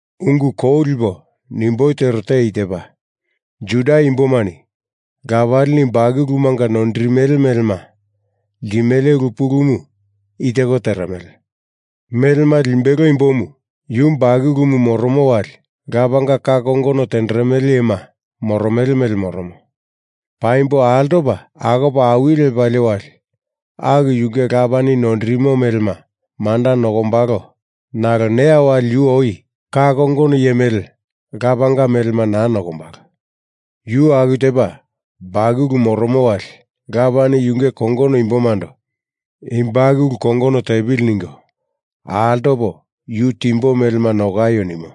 Ungu ko lipo nimboi tero te i tepa. Juda imbomani lapalini bakulumanga noindirimele melema ltimele ulu pulumu i teko teremele. Melema limbelo imbomu yu bakulumu moromo wali lapanga ka kongono tenderemele iyema moromele mele moromo. Paimbo altopa akopa awili lepalie wali aku yunge lapani noindirimo melema manda nokombalo nalo neya wali yu oi ka kongono iye mele lapanga melema naa nokombalo. Yu aku tepa bakulu moromo wali lapani yunge kongono imbomando i bakulu kongono tepili ningo altopo yu timbo melema nokaio nimo.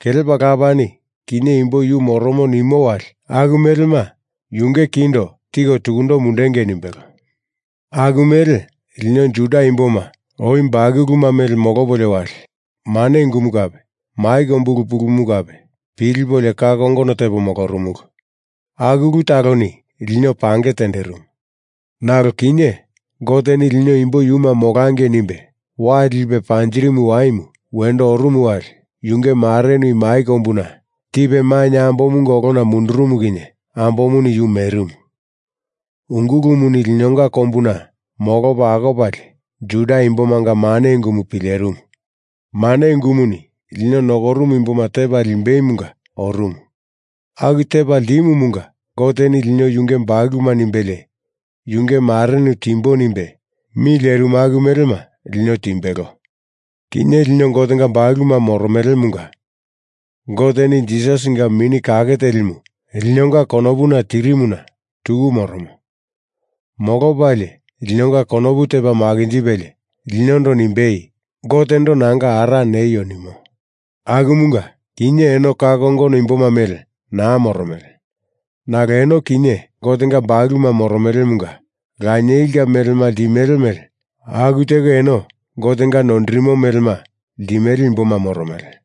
Kelepa lapani kinye imbo yu moromo nimo wali aku melema yunge kindo tiko tukundo mundungei nimbelo. Aku mele lino Juda imboma oi bakuluma mele molopolio wali mane ungumu kape mai kombu ulu pulumu kape pilipolio ka kongono tepo molorumulu. Aku ulu taloni lino pange tenderimu. Nalo kinye Goteni lino imbo yuma molangei nimbe wai lipe panjirimu waimu wendo orumu wali yunge marenu i mai kombuna tipe mainye ambomunga olona mundurumu kinye ambomuni yu merimu. Ungulumuni linonga kombuna molopa akopalie Juda imbomanga mane ungumu pilerimu. mane ungumuni lino nokorumu imboma tepa limbeimunga orumu. Aku tepa ltimumunga Goteni lino yunge bakuluma nimbelie yunge marenu timbo nimbe mi lerimu aku melema lino timbelo. Kinye lino Gotenga bakuluma moromelemunga Goteni Jisasinga Mini Kake Telimu linonga konopuna tirimuna tuku moromo. Molopalie linonga konopu tepa makinjipelie linondo nimbei Gotendo nanga ara neio nimo. Akumunga, kinye eno ka kongono imboma mele naa moromele. Nalo eno kinye Gotenga bakuluma moromelemunga lanielinga melema ltimele mele aku teko eno Gotenga noindirimo melema ltimele imboma moromele.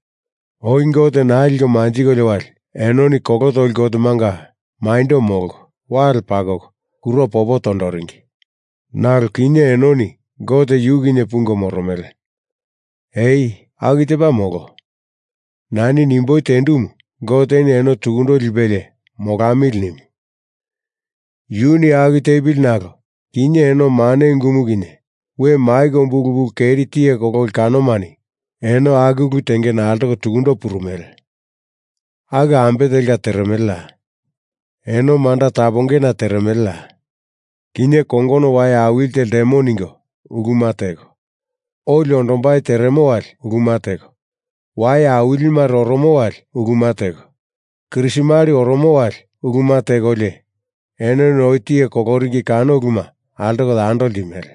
Oi Gote naa liko manjikolio wali enoni kolo toli gotemanga maindo molko wale pakoko kuro popo tondoringi. Nalo kinye enoni Gote yu kinye pungo moromele. Ai, aku tepa molo. Nani nimboi tendumu Goteni eno tukundo lipelie molamili nimu. Yuni aku tepili nalo kinye eno mane ungumu kinye we mai kombu ulu keri tiye kololi kanomani eno aku ulu tengena altoko tukundo purumele. Aku ambe telka teremeleya? Eno manda tapongena teremeleya? Kinye kongono wai awili te ltemo ningo uluma teko, oli ondombai teremo wali uluma teko, wai awilimare oromo wali uluma teko Krismali oromo wali uluma tekolio enoni oi tiye koloringi kano uluma altoko yando ltimele.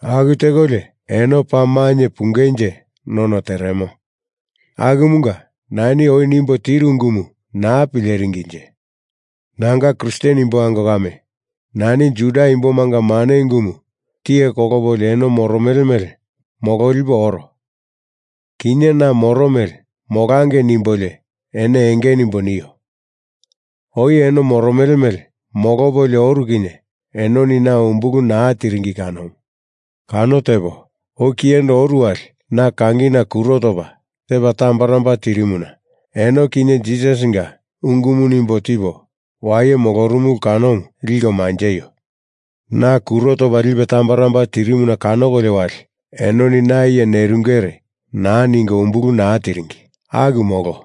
Aku tekolio eno paa mainye pungenje none teremo. Akumunga nani oi nimbo tiru ungumu naa pileringinje. Nanga Kristen imbo ango kame, nani Juda imbomanga mane unguma tiye kolopolio eno moromele mele mololipo oro. Kinye na moro mele molangei nimbolio eno enge nimbo nio. Oi eno moromele mele molopolio oru kinye enoni na umbulu naa tiringi kanomu. Kano tepo oi kiyendo oru wali na kangina kuro topa tepa tambaramba tirimuna eno kinye Jisasinga ungumu nimbo tipo waye molorumulu kanomu liko manjeio. Na kuro topa lipe tambaramba tirimuna kanokolio wali enoni na iye nerungere naa ningo umbulu naa tiringi. Aku molo.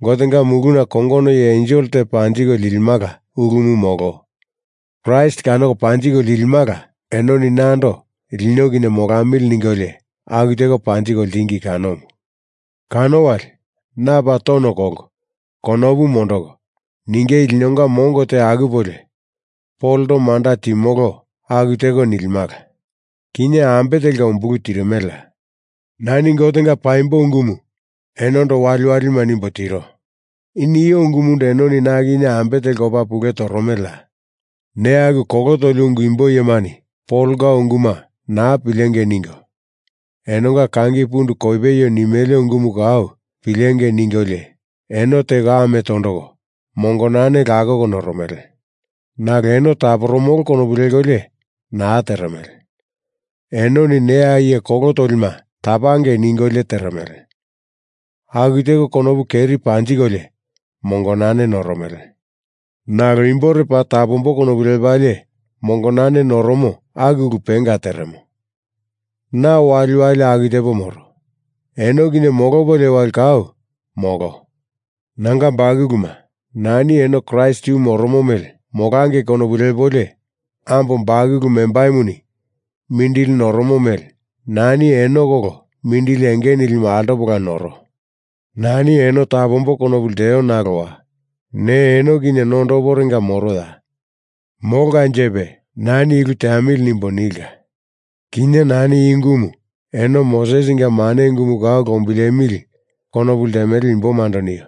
Gotenga muluna kongono iye ensel te panjiko lilimala ulumu molo Kraist kanoko panjiko lilimala enoni nando lino kinye molamili ningolio aku teko panjiko ltingi kanomu. Kano wali na paa tono kolko konopu mondoko ningei linonga mongo te akupolio Polondo manda timolo aku teko nilimala. Kinye ambe telka umbulu tirimeleya? Nani Gotenga paimbo ungumu enondo waliwali nimbo tiro. I nio ungumundo enoni na kinye ambe telka opa pule toromeleya? Neya aku kolo toli ungu imbo iyemani Polonga unguma naa pilengei ningo enonga kangi pundu kopeio nimele ungumu kau pilengei ningolio eno teko amo tondoko mongonane lakoko noromele. Nalo eno taporomolo konopu lekolio naa teremele. Enoni ne iye kolo tolima tapangei ningolio teremele. Aku teko konopu keri panjikolio mongonane noromele. Nalo imbore paa tapambo konopu lepalie mongonane noromo aku ulu penga teremo. Na waliwali aku tepo moro. Eno kinye molopolio wali kau, molo. Nanga bakuluma, nani eno Kraist yu moromo mele molangei konopu lepolio ambo bakulu membaimuni mindili noromo mele nani eno kolo mindili enge nilimu altopola noro. Nani eno tapombo konopu lteo nalowa ne eno kinye nondoporenga moroya! Molkanjepe nani i ulu teamili nimbo nilka. Kinye nani i ungumu eno Mosesinga mane ungumu kau lombilemili konopu ltemele imbomando nio.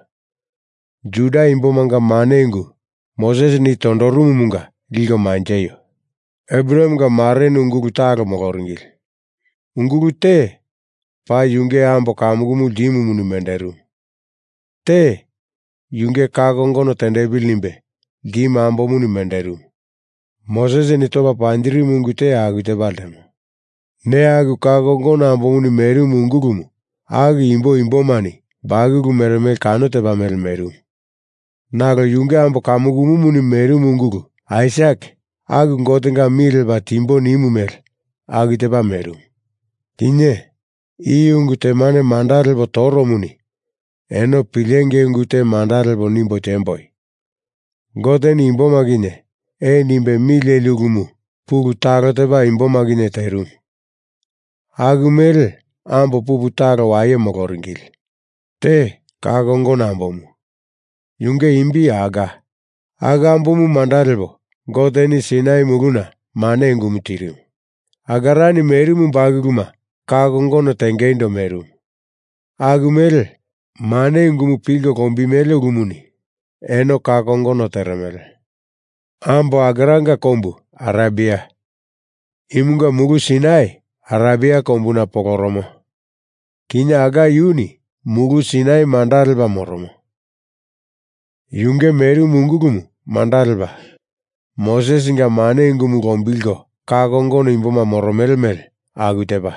Juda imbomanga mane ungu Mosesini i tondorumumunga liko manjeio. Abrahamenga marenu ungulu talo moloringili. Ungulu te paa yunge ambo kamukumu ltimumuni menderimu. Te yunge ka kongono tendepili nimbe ltimu ambomuni menderimu. Mosesini topa panjirimu ungu te aku tepa ltemo. Neya aku ka kongono ambomuni merimu ungulumu aku imbo imboni bakulu meremele kano tepa mele merimu. Nalo yunge ambo kamukumuni merimu ungulu Aisak aku Gotenga mi lepa timbo nimu mele aku tepa merimu. Kinye i ungu temane manda lepo toromuni eno pilengei ungu te manda lepo nimbo temboi, Goteni imboma kinye ee nimbe mi leli ulumu pulu talo tepa imboma kinye terimu. Aku mele ambo pupu talo waye moloringili. Te ka kongono ambomu, yunge imbi Hagar. Aku ambomu manda lepo Goteni Sainai muluna mane ungumu tirimu. Hagarani merimu bakuluma ka kongono tengeindo merimu. Aku mele, mane ungumu pilko lombimele ulumuni eno ka kongono teremele. Ambo Hagaranga kombu Arebia. Imunga Mulu Sainai Arebia kombuna poloromo kinye Hagar yuni Mulu Sainai manda lepa moromo. Yunge merimu ungulumu manda lepa Mosesinga mane ungumu lombilko ka kongono imboma moromele mele aku tepa.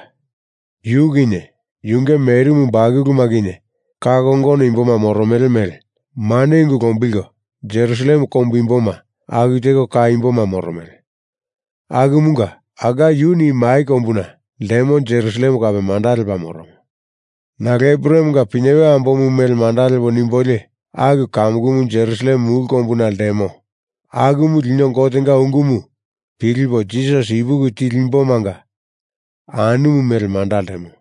Yu kinye yunge merimu bakuluma kinye ka kongono imboma moromele mele mane ungu lombilko Jerusalem kombu imboma aku teko ka imboma moromele. Akumunga Hagar yuni i mai kombuna ltemo Jerusalem kape manda lepa moromo. Nalo Abrahamenga pinyewe ambomu mele manda lepo nimbolio aku kamukumu Jerusalem mulu kombuna ltemo akumu lino Gotenga ungumu pilipo Jisasi ipuki tili imbomanga anumu mele manda ltemo.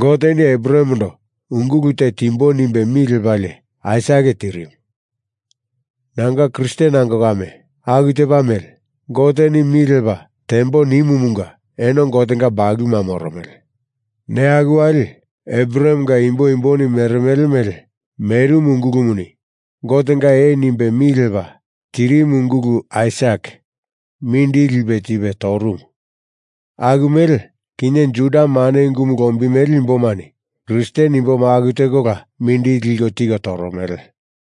Goteni Abrahamendo ungulu te timbo nimbe mi lepalie Aisak tirimu. Nanga Kristen ango kame aku tepa mele Goteni mi lepa tembo nimumunga eno Gotenga bakuluma moromele. Neya aku wali Abrahamenga imbo imboni meremele mele merimu ungulumuni Gotenga ee nimbe mi lepa tirimu ungulu Aisak mindili lipe tipe torumu. Aku mele, kinye Juda mane ungumu lombiltimele imbomani Kristen imboma aku tekola mindili liko tiko toromele.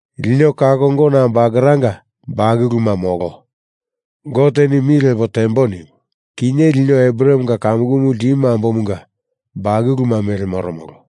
Lino ka kongono ambo Hagaranga bakuluma, molo. Goteni mi lepo tembo nimu kinye lino Abrahamenga kamukumu ltimu ambomunga bakulu mele moromolo.